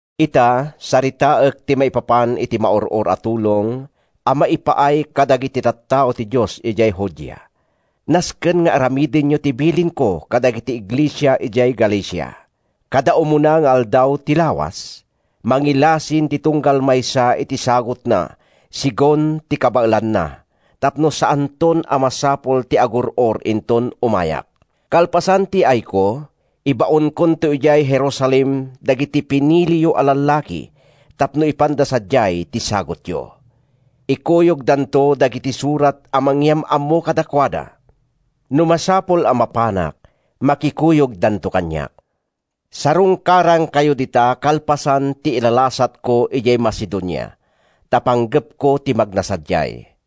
Ita, saritaek ti maipapan iti maur-or a tulong a maipaay kadagiti tattao ti Dios idiay Judea. Nasken nga aramidenyo ti bilinko kadagiti iglesia idiay Galacia. Kada umuna nga aldaw ti lawas, mangilasin ti tunggal maysa iti sagutna segun ti kabaelanna tapno saanton a masapul ti agur-or inton umayak. Kalpasan ti yaayko, ibaonkonto idiay Jerusalem dagiti piniliyo a lallaki tapno ipanda sadiay ti sagutyo. Ikuyogdanto dagiti surat a mangyam-ammo kadakuada. No masapul a mapanak, makikuyogdanto kaniak. Sarungkarankayo dita kalpasan ti ilalasatko idiay Macedonia—ta panggepko ti magna sadiay.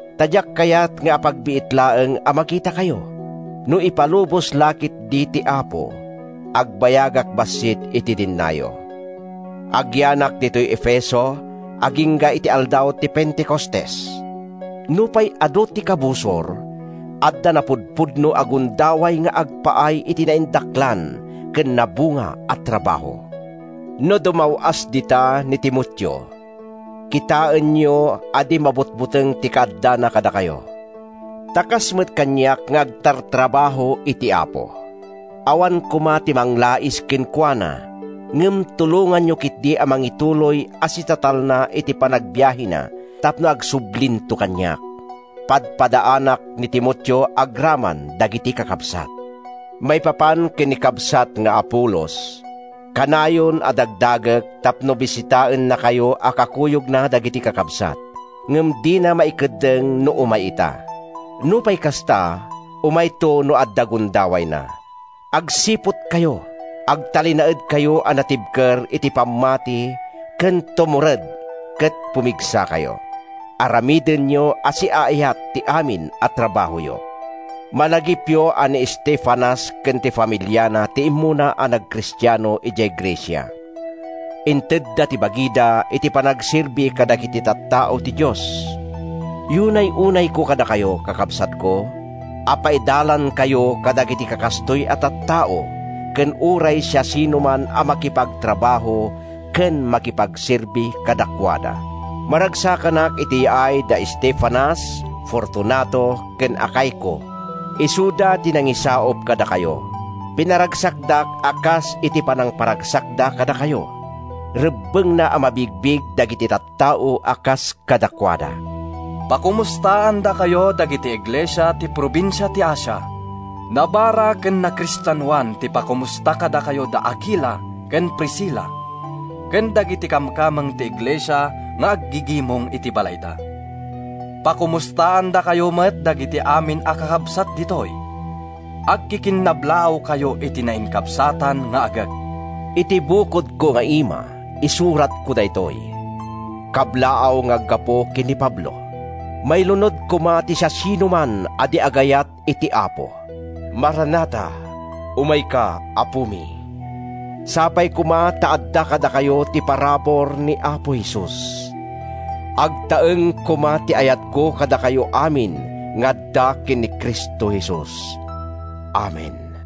Ta diak kayat nga apagbiit laeng a makitakayo. No ipalubos la ketdi ti Apo, agbayagak bassit iti dennayo. Agyanak ditoy Efeso agingga iti aldaw ti Pentecostes. Nupay adu ti kabusor, adda napudpudno a gundaway nga agpaay iti naindaklan ken nabunga a trabaho. No dumaw-as dita ni Timoteo, kitaenyo a di mabutbuteng iti kaaddana kadakayo, ta kas met kaniak nga agtartrabaho iti Apo. Awan koma ti manglais kenkuana, ngem tulonganyo ketdi a mangituloy a sitatalna iti panagbiahena tapno agsublinto kaniak. Padpadaanak ni Timoteo agraman dagiti kakabsat. Maipapan ken ni kabsat nga Apolos: kanayon a dagdagek tapno bisitaennakayo a kakuyogna dagiti kakabsat, ngem dina maikeddeng no umay ita. Nupay kasta, umayto no adda gundawayna. Agsiputkayo. Agtalinaedkayo a natibker iti pammati ket tumured ket pumigsakayo. Aramidenyo a siaayat ti amin a trabahoyo. Malagipyo a ni Estefanas ken ti familiana ti immuna a nagkristiano idiay Grecia. Intedda ti bagida iti panagserbi kadagiti tattao ti Dios. Yunay-unayko kadakayo, kakabsatko, a paidalankayo kadagiti kakastoy a tattao ken uray siasinoman a makipagtrabaho ken makipagserbi kadakuada. Maragsakanak iti yaay da Estefanas, Fortunato ken Acaico. Isuda ti nangisaup kadakayo. Pinaragsakdak a kas iti panangparagsakda kadakayo. Rebbengna a mabigbig dagiti tattao a kas kadakuada. Pakomustaandakayo dagiti iglesia ti probinsia ti Asia. Nabara ken nakristianoan ti pakomusta kadakayo da Akila ken Priscila, ken dagiti kamkameng ti iglesia nga aggigimong iti balayda. Pakomustaandakayo met dagiti amin a kakabsat ditoy. Agkikinnablaawkayo iti nainkabsatan nga agek. Iti bukodko nga ima isuratko daytoy: Kablaaw nga aggapu ken ni Pablo. Mailunod koma ti siasinoman a di agayat iti Apo! Maranatha—Umayka, Apomi! Sapay koma ta adda kadakayo ti parabur ni Apo Jesus. Agtaeng koma ti ayatko kadakayo amin nga adda ken ni Cristo Jesus. Amen.